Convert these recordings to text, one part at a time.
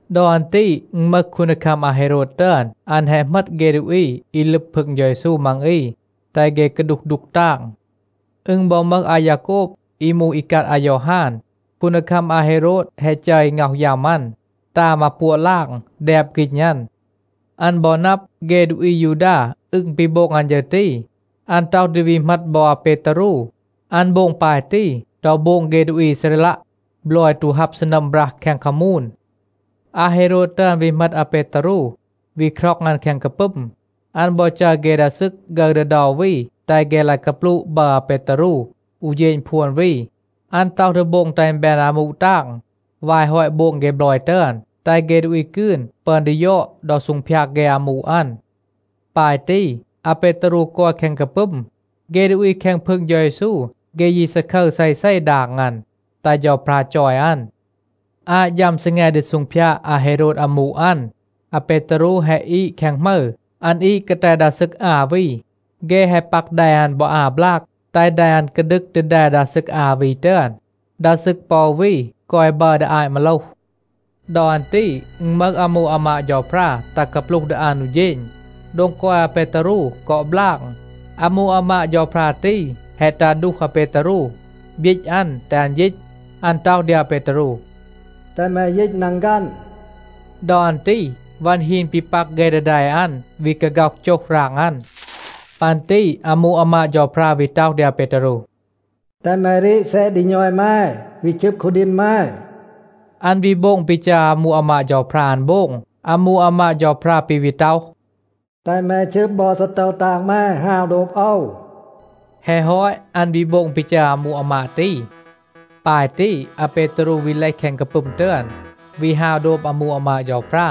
ดอ อัน ตี อึณ มึห คูนดีคัม อาเฮโรด ตึอน. อัน แฮะ เหมต เฆ ดูอี อี ลึบ พึง เฌา เยซู มัง อี, แตห เฆ กาดูห ดูก ตาง. อึณ บอ มึห อายาโกบ, อี มูห อีกัด อายอฮาน. คูนดีคัม อาเฮโรด แฮะ จัร อี ง็อห ยัม อัน, ตา มาปัวะ ลาง, แดบ ฆีณ อัน. อัน บอ นับ, เฆ ดูอี อายูดา อึง ปี โบง อัน ฌึร ตี, อัน ต็อห ดี วี เหมต บอ อาเปตารู. อัน โบง ปาย ตี ดอ โบง เฆ ดูอี อีซาเรลัะ บลอย ตู ฮับ ซีนัม บรัห แคง คามูน. อาเฮโรด ตึอน วี เหมต อาเปตารู, วี คร็อง อัน แคง กาปึม. อัน บอ จัร เฆ ดา ซึก ฆึร ดี เดา วี, แตห เฆ ลาย กาปลูะ บัร อาเปตารู อู เฌณ พวน วี. อัน ต็อห ดี โบง แตห อึณ แบน อามู ตาง วาย ฮอต โบง เฆ บลอย ตึอน, แตห เฆ ดูอี กืน ปึอน ดี ยอด ดอ ซูงพยาด เฆ อามู อัน. ปาย ตี, อาเปตารู กอย แคง กาปึม. เฆ ดูอี แคง พึง เฌา เยซู, เฆ ยี ซาคึร เซเซ ดาง อัน, แตห เฌาพรา จอย อัน. อาต ฌัม ซีแง ดี ซูงพยาด อาเฮโรด อามู อัน, อาเปตารู แฮะ อีด แคง หมึร. อัน อีด กาแต ดา ซึก อา วี. เฆ แฮะ ปัก แด อัน บอ อา บลาก, แตห แด อัน กาดึก ดี แด ดา ซึก อา วี ตึอน. ดา ซึก ปอ อู วี กอย บัร ดี อาต มาโลห. ดอ อัน ตี อึณ มึห อามู อามาด เฌาพรา ตัห กาปลูห ดี อัน อู เฌณ. โดง กอย อาเปตารู กอ บลาง. อามู อามาด เฌาพรา ตี แฮะ ตัห ดูห อาเปตารู, บยีต อัน, แตห อัน ยีต. อัน ต็อห ดี อาเปตารู, “แตห แม ยีต นังฆัน.” ดอ อัน ตี วัน ฮีน ปี ปัก เฆ ดี แด อัน, วี กาฆ็อห โจห ราง อัน. ปัน ตี อามู อามาด เฌาพรา วี ต็อห ดี อาเปตารู, “แตห แม รีด แซะ ดี ณอย แม, วี ชึบ คูดีณ แม.” อัน วี โบง ปี จัร อามู อามาด เฌาพรา อัน โบง. อามู อามาด เฌาพรา ปี วี ต็อห, “แตห แม ชึบ บอ ซีโตว ตาง แม ฮาว โดบ โอว.” แฮะ ฮอต, อัน วี โบง ปี จัร อามู อามาด ตี. ปาย ตี, อาเปตารู วี เลห แคง กาปึม ตึอน, วี ฮาว โดบ อามู อามาด เฌาพรา.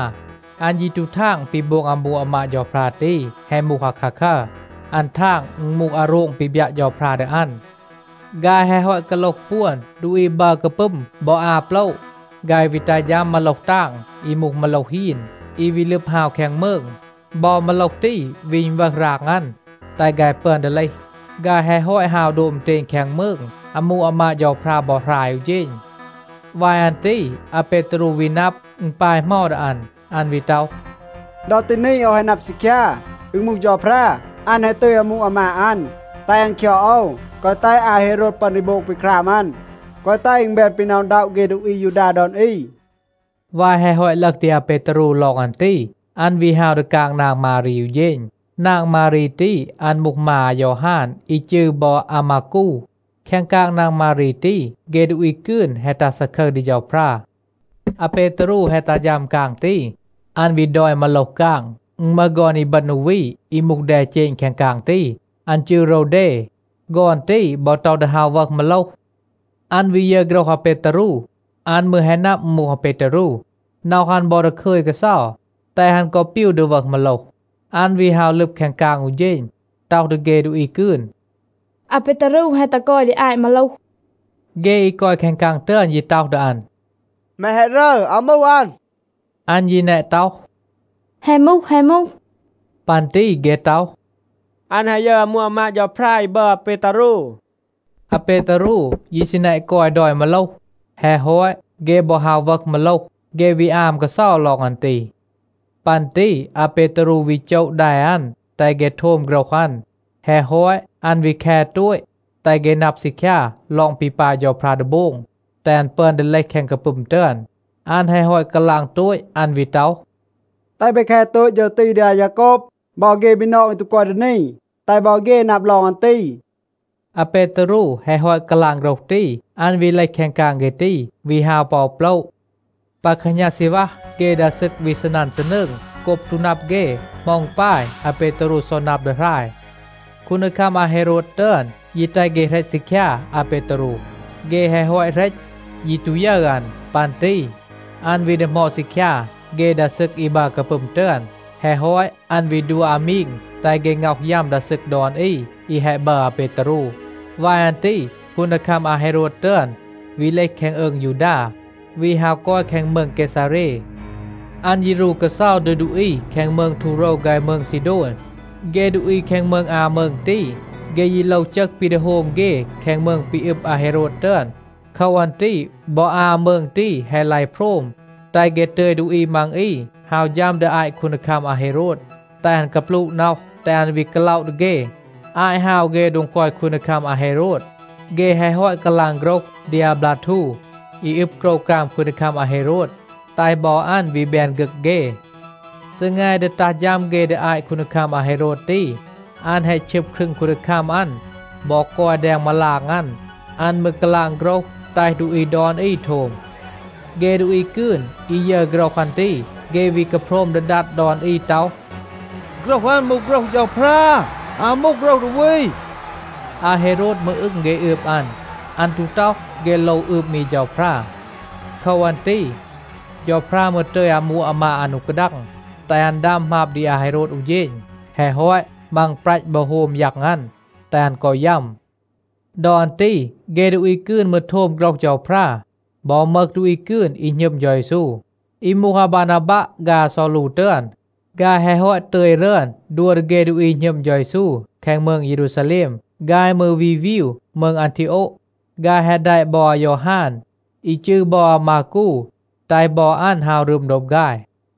อัน ยี ตู ทาง ปี โบง อามู อามาด เฌาพรา ตี แฮะ มูห อาคาคัร. อัน ทาง, อึณ มูห อาโรง ปี บยัะ เฌาพรา ดี อัน. ฆาย แฮะ ฮอต กาโลห ปวน ดูอี บัร กาปึม บอ อา โปละ, ฆาย วี ตัห ฌัม มาโลห ตาง, อี มูห มาโลห ฮีน, อี วี ลึบ ฮาว แคง มืง. บอ มาโลห ตี วี อึณวึห ราง อัน, แตห ฆาย ปึอน ดี เลห. ฆาย แฮะ ฮอต ฮาว โดบ อึณเตณ แคง มืง, อามู อามาด เฌาพรา บอ หราย อู เฌณ. วาย อัน ตี อาเปตารู วี นับ, อึณ ปาย เหมา ดี อัน. อัน วี ต็อห, “ดอ ตี นี โอว แฮะ นับ ซีคยา, อึณ มูห เฌาพรา. อัน แฮะ ตึย อามู อามาด อัน, แตห อัน คยอด โอว, แกวะ แตห อาเฮโรด ปึอน ดี โบง ปี คราม อัน, แกวะ แตห อึณ แบน ปี หน็อะ อึณด็อะ เฆ ดูอี อายูดา ดอน อี.” วาย แฮะ ฮอต ลึห ดี อาเปตารู ลอง อัน ตี, อัน วี ฮาว ดี กาง นาง มารี อู เฌณ. นาง มารี ตี, อัน มูห มา อายอฮาน อี จืร บอ อามากู. แคง กาง นาง มารี ตี, เฆ ดูอี กืน แฮะ ตัห ซาคึร ดี เฌาพรา. อาเปตารู แฮะ ตัห ฌัม กาง ตี, อัน วี ดอย มาโลห กาง. อึณ มึห ฆอน อีบึณ อู วี อี มูห แดเจณ แคง กาง ตี. อัน จืร โรวเด. ฆอน ตี บอ ต็อห ดี ฮาว วึห มาโลห. อัน วี ยึร โฆรห อาเปตารู, อัน มืร แฮะ นับ อึณ มูห อาเปตารู, น็อห อัน บอ ดาคึย กาเซา, แตห อัน กอ ปีว ดี วึห มาโลห. อัน วี ฮาว ลึบ แคง กาง อู เฌณ, ต็อห ดี เฆ ดูอี กืน, “อาเปตารู แฮะ ตัห กอย ดี อาต มาโลห.” เฆ อี กอย แคง กาง ตึอน ยี ต็อห ดี อัน, “แม แฮะ รึร. อาว มูห อัน.” อัน ยี แนะ ต็อห, “แฮะ มูห, แฮะ มูห.” ปัน ตี เฆ ต็อห, “อัน แฮะ ยึร อามู อามาด เฌาพรา อี บัร อาเปตารู.” อาเปตารู ยี ซี แนะ กอย ดอย มาโลห. แฮะ ฮอต, เฆ บอ ฮาว วึห มาโลห. เฆ วี อาม กาเซา ลอง อัน ตี. ปัน ตี อาเปตารู วี โจะ แด อัน, แตห เฆ โทม โฆรห อัน. แฮะ ฮอต, อัน วี แค โตต, แตห เฆ นับ ซีคยา ลอง ปี ปาย เฌาพรา ดี โบง, แตห อัน ปึอน ดี เลห แคง กาปึม ตึอน. อัน แฮะ ฮอต กาลาง โตต, อัน วี ต็อห, “แตห เบ แค โตต ฌึร ตี ดี อายาโกบ บอ เฆ บีนอง อี ตู กอย ดี นี, แตห บอ เฆ นับ ลอง อัน ตี.” อาเปตารู แฮะ ฮอต กาลาง โฆรห ตี, อัน วี เลห แคง กาง เฆ ตี, วี ฮาว ปอ อู โปละ. ปา แคหณา ซีณวัห, เฆ ดา ซึก วี ซีนัน ซีนืง โกบ ตู นับ เฆ เหมา อึณ ปาย, อาเปตารู ซอ นับ ดี หราย. คูนดีคัม อาเฮโรด ตึอน ยี แตห เฆ เหรต ซีคยา อาเปตารู. เฆ แฮะ ฮอต เหรต, ยี ตู ยึร อัน. ปัน ตี อัน วี ดีหมอด ซีคยา เฆ ดา ซึก อี บัร กาปึม ตึอน, แฮะ ฮอต อัน วี ดัว อามีง แตห เฆ ง็อห ยัม ดา ซึก ดอน อี, อี แฮะ บัร อาเปตารู. ลอง คูนดีคัม อาเฮโรด ยัม วาย อัน ตี คูนดีคัม อาเฮโรด ตึอน วี เลห แคง อืง ยูดา, วี ฮาว กอย แคง มืง เกซาเร. อัน ยี รู กาเซา ดี ดูอี แคง มืง ทูโรว ฆาย มืง ซีโดน. เฆ ดูอี แคง มืง อา มืง ตี, เฆ ยี โลว จึห ปี ดี โฮม เฆ แคง มืง ปี อึบ อาเฮโรด ตึอน. โคว อัน ตี บอ อา มืง ตี แฮะ ลาย โพรม, แตห เฆ ตึย ดูอี มัง อี ฮาว ฌัม ดี อาต คูนดีคัม อาเฮโรด, แตห อัน กาปลูะ น็อห, แตห อัน วี กาล็อะ ดี เฆ. อาต ฮาว เฆ โดง กอย คูนดีคัม อาเฮโรด, เฆ แฮะ ฮอต กาลาง โฆรห ดี อาบลาทู, อี อึบ โกรวกราม คูนดีคัม อาเฮโรด, แตห บอ อัน วี แบน ฆึก เฆ. ซีแง ดี ตัห ฌัม เฆ ดี อาต คูนดีคัม อาเฮโรด ตี, อัน แฮะ ชึบ ครึง คูนดีคัม อัน บอ กอย แดง มาลาง อัน. อัน มืร กาลาง โฆรห แตห ดูอี ดอน อี โทม. เฆ ดูอี กืน อี ยึร โฆรห อัน ตี, เฆ วี กาโพรม ดี ดัด ดอน อี ต็อห, “โฆรห อัน มูห โฆรห เฌาพรา, อาว มูห โฆรห ดูอี.” อาเฮโรด มืร อึง เฆ อืบ อัน. อัน ตู ต็อห, เฆ โลว อืบ มี เฌาพรา. โคว อัน ตี เฌาพรา มืร ตึย อามู อามาด อัน อู กาดัง, แตห อัน ดัม หมาบ ดี อาเฮโรด อู เฌณ. แฮะ ฮอต, มังปรัต บอ โฮม ยัง อัน, แตห อัน กอ ยัม. ดอ อัน ตี เฆ ดูอี กืน มืร โทม โฆรห เฌาพรา, บอ มึห ดูอี กืน อี หณึม เฌา เยซู. อี มูห อาบานาบัะ ฆาย อาซอลู ตึอน, ฆาย แฮะ ฮอต ตึย รึอน ดัว ดี เฆ ดูอี หณึม เฌา เยซู แคง มืง เยรูซาแลม, ฆาย มืร วี วีว มืง อันทีโอะ. ฆาย แฮะ แดะ บอ อายอฮาน, อี จืร บอ อามากู, แตห บอ อัน ฮาว รึม โดบ ฆาย.